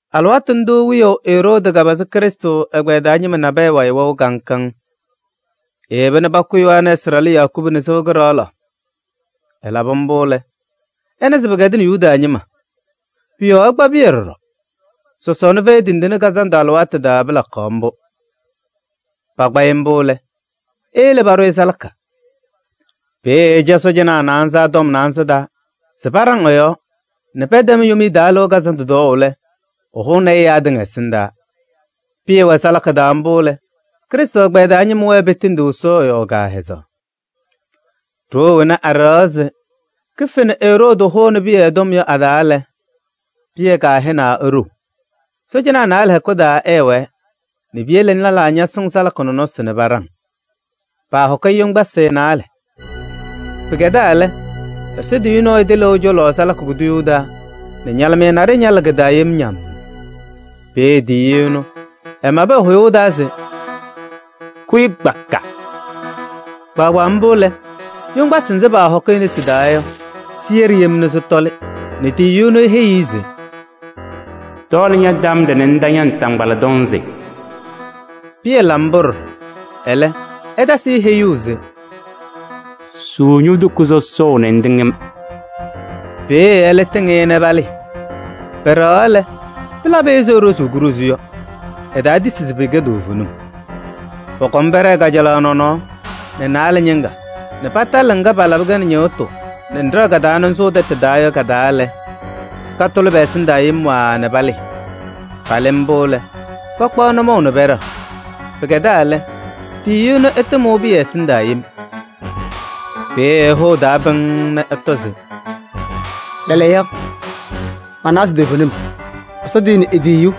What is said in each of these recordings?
Alɩwaatʋ ndʋʋ wiyaʋ Eroodi kapazɩ Krɩstʋ ɛgbɛyɛ taa ñɩma nabɛyɛ wayɩ wɛʋ kaŋ kaŋ. Eyeba nɛ pakʋ Yohanɛɛsɩ ɖalʋ Yakubu nɛ sɩɣa kɩɖaɣlaɣ. Ɛlabɩ mbʋ lɛ, ɛna se pɩkɛdɩnɩ Yuda ñɩma. Pʋ-yɔɔ ɛkpa Pɩyɛ ɖɔɖɔ. Sɔsɔɔna Fɛyɩ Tindine Kazandʋ alɩwaatʋ taa pɩlakaɣ mbʋ. Pakpa-ɩ mbʋ lɛ, eyele paɖʋ-ɩ salaka. Peeye ɛca sɔɔjanaa naanza tɔm naanza taa se paɖaŋ ɛ-yɔɔ nɛ pɛtɛm Yomiye Taa Lɩʋ Kazandʋ tɔɔʋ lɛ, ɛhʋnɩ-ɩ ɛyaa tɩŋa ɛsɩndaa. Pɩyɛ wɛ salaka taa mbʋ lɛ, Krɩstʋ ɛgbɛyɛ taa ñɩma wɛɛ petendiɣ Ɛsɔ ɛ-yɔɔ kaahɛzaɣ. Ɖoo wena aɖɛɣaɣ se kife nɛ Eroodi hʋnɩ Pɩyɛ tɔm yɔ a-taa lɛ, Pɩyɛ kahɛnaa nɛ eɖou. Sɔɔjanaa naalɛ hɛkʋ taa ɛɛwɛɛ nɛ piyele lɛlaa ñasɩŋ salaka nɔnɔsɩ nɛ paɖaŋ. Paahɔkɩ-ɩ yoŋgbasɩ naalɛ. Pɩkɛdaa lɛ, Ɛsɔ tiyiyu nɔɔyʋ tɩlɩʋ ɛ-cɔlɔ salaka kuduyuu taa nɛ ñalɩmɩyɛ naɖɩyɛ ñalɩ kɩ-taa yem ñammm. Peeye tiyiyu ɛnʋ ɛmabɩ ɛ-hʋyʋʋ taa se: “Kʋyɩ kpaka!” Kpaagbaa mbʋ lɛ, yoŋgbasɩ nzɩ paahɔkɩ e-nesi taa yɔ, sɩyɛɖɩ yem nɛ sɩtɔlɩ nɛ tiyiyu ɛnʋ eheyi-i se: “Tɔɔlɩ ña-tambaɖɛ nɛ ŋta ña-naataŋgbala tɔnzɩ.” Pɩyɛ la mbʋ ɖɔɖɔ, ɛlɛ ɛtasɩ-ɩ heyuu se: “Suu ño-toko sɔsɔʋ nɛ ŋtɩŋ-m.” Peeye ɛlɛ tɩŋ-ɩ nɛ palɩɩ. Pɛɖɛɣaɣ lɛ, pɩlabɩ-ɩ ɛzɩ eɖozuu kuɖozu yɔ. Ɛtaatisi se pɩkɛ toovenim. Pɔkɔm pɛɖɛɛ kajalaɣ nɔnɔɔ nɛ naalɛ ñɩŋga nɛ patalɩ ŋga palabɩ-kɛ nɛ ñɩɣtʋ nɛ ŋɖɛɣ-kɛ nɛ ŋsʋʋ tɛtʋ taa yɔ ka-taa lɛ, katʋlɩ pɛ-ɛsɩndaa yem waaa nɛ palɩɩ. Palɩ mbʋ lɛ, pakpaɣ nʋmɔʋ nɛ pɛɖɛɣ. Pɩkɛdaa lɛ, tiyiyu ɛnʋ ɛtɩmʋʋ Pɩyɛ ɛsɩndaa yem. Peeye ɛhʋ ɛ-taa pɩŋŋ nɛ ɛtɔ se: “Lɛɛlɛɛyɔ, manawa se toovenim Ɛsɔ tiyini e-tiyiyu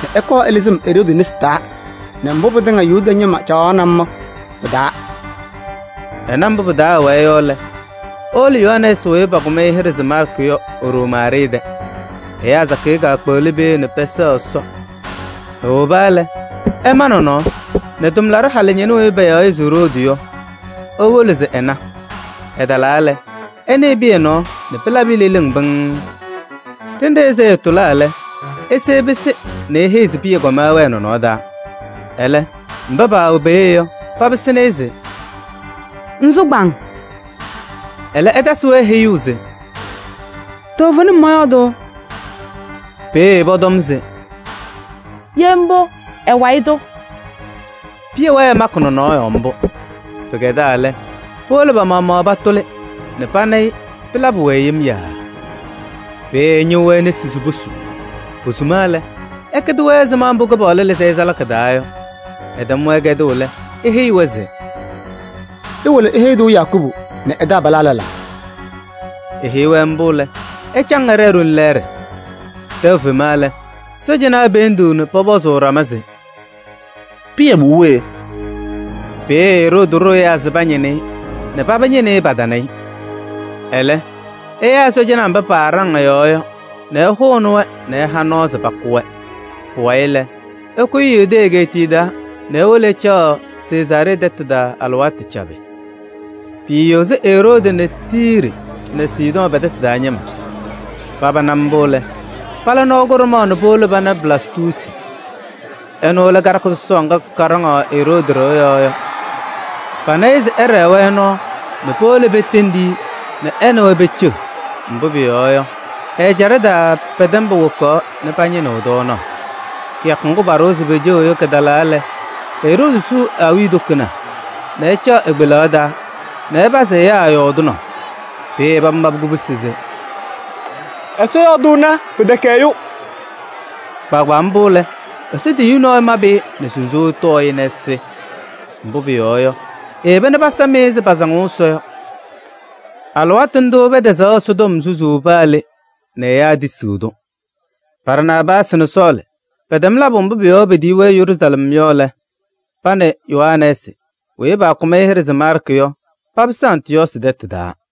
nɛ ɛkɔɔ ɛlɩzɩ-m Eroodi nesi taa nɛ mbʋ pɩtɩŋa Yuda ñɩma caɣaɣnɩ-m yɔ pɩ-taa.” Ɛna mbʋ pɩ-taa ɛwɛɛ yɔ lɛ, ewolo Yohanɛɛsɩ weyi pakʋm-ɩ hɩɖɛ se Maarkɩ yɔ e-ɖoo Maarɩɩ tɛ. Ɛyaa sakɩyɛ kaakpeɣli peeye nɛ pɛsɛɣ Ɛsɔ. Ewoba lɛ, ɛma nɔnɔɔ nɛ tʋmlaɖʋ halʋ ñɩnʋ weyi payaɣ se Roodi yɔ, ewolo se ɛna. Ɛtalaa lɛ, ɛnɩɩ Pɩyɛ nɔɔ nɛ pɩlabɩ-ɩ leleŋ pɩŋŋ. Ɖenɖe ɛzɩ ɛɛtʋlaa lɛ, ese ɛpɩsɩ nɛ eheyi se Pɩyɛ kɔma nɛ ɛwɛɛ nɔnɔɔ taa. Ɛlɛ, mba paawɛ peeye yɔ, papɩsɩnɩ-ɩ se: “Ŋsʋ kpaaŋ!” Ɛlɛ ɛtasɩ-wɛ heyuu se: “Toovenim mɔyɔɔdʋʋ.” Peeye pɔtɔm se: “Ye mbʋ, ɛ-wayɩ tʋ.” Pɩyɛ wɛɛ ɛmakɩ nɔnɔɔ mbʋ. Pɩkɛdaa lɛ, powolo pa-maɣmaɣ patʋlɩ nɛ pana-ɩ nɛ pɩlabɩ-wɛ yem yaaa. Peeye ɛñɩɣ-wɛ nesi se posu. Posuma lɛ, ɛkɛdɩ-wɛ ɛzɩma mbʋ Kɩpaɣlʋ lɩzɩ-ɩ salaka taa yɔ. Ɛtɛm-wɛ kɛdʋʋ lɛ, eheyi-wɛ se: “Iwolo iheyi-tʋ Yakubu nɛ taabalaa lɛlaa.” Eheyi-wɛ mbʋ lɛ, ɛcaŋ ɛɖɛɛ ɖoli lɛɛɖɛ. Tɛʋ fema lɛ, sɔɔjanaa peendiɣ nɛ pɔpɔzʋʋ ɖama se: “Pɩyɛ mʋʋ we?” Peeye Eroodi ɖʋ ɛyaa se pañɩnɩ-ɩ nɛ paba ñɩnɩ-ɩ, patana-ɩ. Ɛlɛ ɛyaa sɔɔjanaa mba paaɖaŋ ɛ-yɔɔ yɔ nɛ ɛhʋnɩ-wɛ nɛ ɛha nɔɔ se pakʋ-wɛ. Pʋwayɩ lɛ, ɛkʋyɩ Yudee egeetiye taa nɛ ewolo ɛcaɣ Sezaaree tɛtʋ taa alɩwaatʋ cabɩ. Piiyozi Eroodi nɛ Tiiri nɛ Sidɔɔ pɛ-tɛtʋ taa ñɩma. Paba na mbʋ lɛ, pala nɔɔ kʋɖʋmaɣ nɛ powolo pana Blastuusi. Ɛnʋ lɛ karɩka sɔsɔɔ ŋga kaɖaŋɩɣ Eroodi ɖɩɣa yɔɔ yɔ. Pana-ɩ se ɛɖɛɛ-wɛ nɔɔ nɛ powolo petendi-i nɛ ɛ nɛ wɛ peceɣ. Mbʋ pʋyɔɔ yɔ, ɛ-ɛjaɖɛ taa pɛ-tɛ ñɩma wokaɣ nɛ pañɩnɩɣ tɔɔnaɣ. Kɩyakʋ ŋgʋ paɖʋwa se peceɣ yɔ kɩtalaa lɛ, Eroodi suu ɛ-awiya toko nɛ ɛcaɣ e-kpelaɣ taa nɛ ɛpazɩ ɛyaa yɔɔdɩnaʋ. Peeye paba mabɩ kubusi se: “Ɛsɔ yɔɔdʋʋna! Pɩtɛkɛ ɛyʋ!” Kpaagbaa mbʋ lɛ, Ɛsɔ tiyiyu nɔɔyʋ mabɩ-ɩ nɛ sunzuuwee tɔɔ-ɩ nɛ ɛsɩ. Mbʋ pʋyɔɔ yɔ, eyeba nɛ pasam-ɩ ɛzɩ pasaŋʋʋ Ɛsɔ yɔ. Alɩwaatʋ ndʋʋ pɛtɛzaɣ Ɛsɔtɔm susuu paa le nɛ ɛyaa tisiɣ-tʋ. Barnaabaasɩ nɛ Sɔɔlɩ pɛtɛm labʋ mbʋ pʋ-yɔɔ petiyi-wɛ Yeruusalɛm yɔ lɛ, pa nɛ Yohanɛɛsɩ weyi pakʋm hɩɖɛ se Maarkɩ yɔ papɩsɩ Antɩyɔɔsɩ tɛtʋ taa.